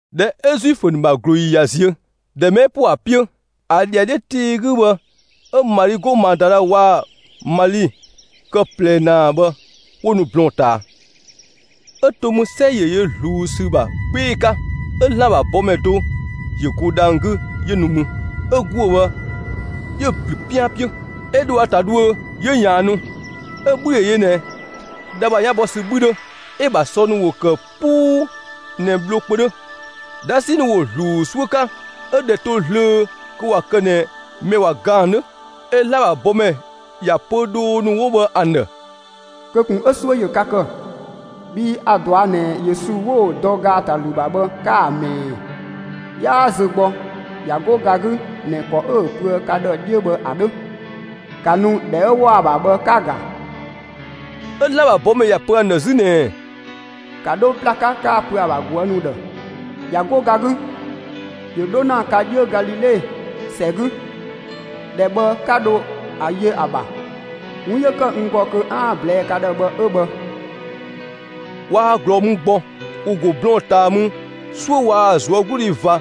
꞊Dhɛ 'ö Zuifö ‑nu ‑bha ꞊glooyi ꞊ya ziö, ‑dhɛ mɛ 'ö ‑po ‑a 'piö, ‑a ‑dhiadhiö tii 'gü bhë 'ö Mali 'go Madala waa‑ Mali kë ꞊plɛ ‑naa bhë 'wo nu blɔɔn‑ ꞊taa. 'Ö to mü 'sɛ ‑yö yö ꞊zluun ‑sü ‑bha 'gbee‑ 'ka, 'ö ‑Zlan ‑bha bɔmɛ do ‑yö go dhang‑ 'gü 'yö nu mü, 'ö ‑guö bhë 'yö‑ ‑blü 'pian 'piö, 'ö dho ‑a ‑ta dhuö, 'yö ꞊yaannu. 'Ö‑ 'bhü ‑yö yö ꞊nɛ dha ‑bha 'yan bɔ ‑sü 'bhü 'dhö, 'ö‑ ‑bha sɔ ‑nu ‑wo ‑kë 'puu ꞊nɛ bhlo kpö 'dhö. 'Dhasi ‑nu ‑wo ‑zluun 'suö 'ka, 'ö ꞊dhɛ to zlöö kö ꞊wa kë ꞊nɛ mɛ ꞊wa ga ‑an 'dhö. 'Ö ‑Zlan ‑bha bɔmɛ ‑ya pö dhoo ‑nu 'wo bhë ‑an ‑dhë: «Kö ꞊kun 'ö 'suö ‑yö ka ‑kë! Bhii a‑ ꞊dɔa' ꞊nɛ Yesu 'wo‑ dɔ ‑gaatalü ‑bha bhë 'ka‑ ꞊mɛɛ. 'Yaa zö gbɔ, ꞊ya 'go ga 'gü ꞊nɛ ‑kɔ 'ö‑ pöë ka ‑dhë 'dhiö bhë ‑a 'dhö. ‑Ka nu ‑dhɛ 'ö ‑wɔ ‑a ‑bha bhë 'ka‑ ‑ga!» 'Ö ‑Zlan ‑bha bɔmɛ ‑ya pö ‑an ‑dhë 'zü ꞊nɛɛ: «‑Ka 'dho ‑bla 'ka 'ka‑ pö ‑a ‑bha ꞊guë' ‑nu ‑dhë: ‹꞊Ya 'go ga 'gü, ‑yö 'dho ‑na ka 'dhiö Galile ‑sɛ 'gü. ‑Dhɛ bhë 'ka dho ‑a yö ‑a ‑bha›. 'Wun 'yö ‑kë n ‑gɔ 'aan‑ ꞊blɛɛ'‑ ka ‑dhë bhë 'ö bhë.» Waa ꞊glɔɔ mü gbɔ, ‑wo ‑go blɔɔn‑ ꞊taa mü, 'suö waa‑ ꞊zuögludhi ꞊va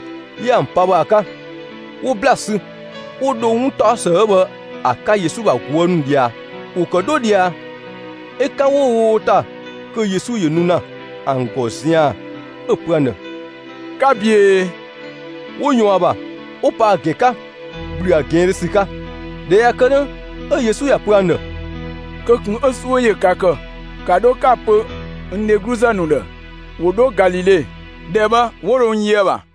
'yö ‑an pa bhë ‑a 'ka. 'Wo ‑bla sü, 'wo dho 'wuntaɔsë 'ö bhë ‑a 'ka Yesu ‑bha ꞊guë' ‑nu ꞊dhia. ‑Wo ‑kë 'dho ꞊dhia, 'ö 'kan 'wo‑ wo ‑ta, kö Yesu ‑yö nu ‑na ‑an ‑gɔ zian‑, 'ö‑ pö ‑an ‑dhë: «'Ka ꞊büee!» 'Wo ꞊yɔɔn ‑a ‑bha, 'wo pa ‑a ‑gɛn 'ka, ‑gblü ‑a ꞊gɛɛndhö ‑sü 'ka. ꞊Dhɛ ꞊ya kë 'dhö, 'ö Yesu ‑ya pö ‑an ‑dhë: «Kö ꞊kun 'ö 'suö ‑yö ka ‑kë! ‑Ka 'dho 'ka‑ pö n dhegluzë ‑nu ‑dhë ‑wo 'dho Galile, ‑dhɛ bhë 'wo dho n yö ‑a ‑bha.»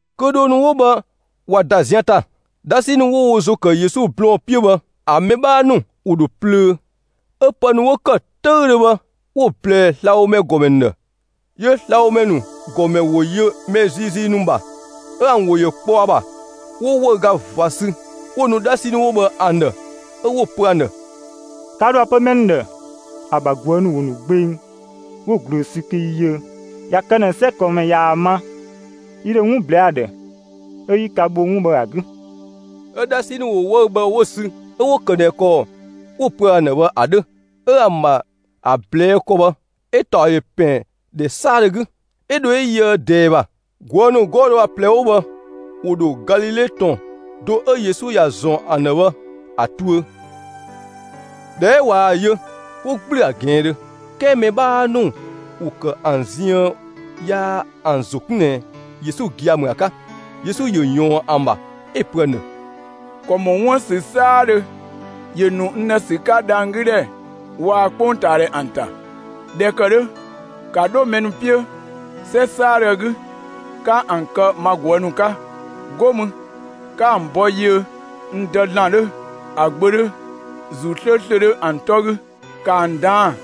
Kö dhoo ‑nu 'wo bhë ꞊wa ‑da zian ‑ta, 'dhasi ‑nu 'wo wo ‑zo ‑kë Yesu blɔɔn‑ 'piö bhë, ‑an mɛ 'bhaa ‑nu, ‑wo ‑dho plöö, 'ö pë ‑nu 'wo ‑kë 'töüdhö bhë, 'wo‑ ꞊blɛɛ slabhomɛ ‑gɔmɛ ‑nu ‑dhë. 'Yö slabhomɛ ‑nu ‑gɔmɛ ‑wo yö mɛ ziizii ‑nu ‑bha, 'ö ‑an ‑wo ‑yö kpɔ ‑a ‑bha, 'wo 'wëüga ꞊va sü 'wo‑ nu 'dhasi ‑nu 'wo bhë ‑an ‑dhë, 'Ö 'wo‑ pö ‑an ‑dhë: «Ka ‑dho ‑a pö mɛ ‑nu ‑dhë: ‹‑A ‑bha ꞊guë' ‑nu ‑wo ‑nu gbeng, 'wo‑ ꞊glöö sü kö yi yiö.› ꞊Ya kë ꞊nɛ 'sɛ ꞊kɔɔnmɛ ꞊yaa‑ ma, yi ‑dho 'wun ꞊blɛɛ'‑ ‑a ‑dhë, 'ö 'yi ka bho 'wun bhë ‑a 'gü.» 'Ö 'dhasi ‑nu ‑wo 'wëü‑ bhë 'wo‑ sü, 'ö 'wo‑ ‑kë ꞊nɛ ‑kɔ 'wo‑ pöë ‑an ‑dhë bhë ‑a 'dhö. 'Ö ‑an ‑bha ‑a ꞊blɛɛ' ‑kɔ bhë, 'ö‑ ‑taɔ ‑yö ‑pɛn ‑dhɛ 'saadhö 'gü, 'ö dho 'ö yöë ꞊dɛɛ ‑bha. ꞊Guë' ‑nu 'gɔɔ‑ do ö ga do 'wo bhë ‑wo ‑dho Galile ‑tɔn do 'ö Yesu ‑ya ‑zɔn ‑an ‑dhë bhë ‑a tuö. ꞊Dhɛ 'ö ꞊waa‑ yö, 'wo ‑gblü ‑a ꞊gɛɛndhö; 'kɛɛ mɛ 'bhaa ‑nu ‑wo ‑kë ‑an ziën yaa ‑an ‑zo 'kun ꞊nɛ Yesu gia‑ ‑mü ‑a 'ka. Yesu ‑yö ‑yɔɔn ‑an ‑bha, 'ö‑ pö ‑an ‑dhë: «‑Kɔ ‑mɔ 'wuën‑ ‑sü 'saadhö ‑yö ‑nu n ‑dhë ‑sü 'ka dhanggüdhɛ waa‑ 'kpongtaadhɛ ‑an ‑ta. ꞊Dhɛ ‑kë 'dhö, ‑ka 'dho mɛ ‑nu 'piö 'sɛ 'saadhö 'gü, 'ka ‑an kë ma ꞊guë' ‑nu 'ka! 'Go mü, 'ka ‑an ‑bɔ yiö n Dë ‑Zlan 'dhö, ‑a Gbö 'dhö, ‑Zuu 'slööslö 'dhö ‑an 'tɔ 'gü! ‑Ka ‑an ꞊daan'‑,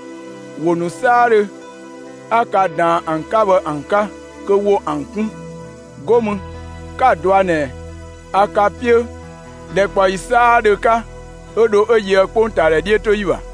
‑wo ‑nu 'saadhö 'a ka ꞊daan ‑an 'ka bhë ‑an 'ka, kö ‑wo ‑an 'kun! 'Go mü, 'ka‑ dɔa ꞊nɛ a ka 'piö ‑dhɛkpaɔyi 'saadhö 'ka, 'ö dho 'ö yöë 'kpongtaadhɛ 'dhiötoyi ‑bha.»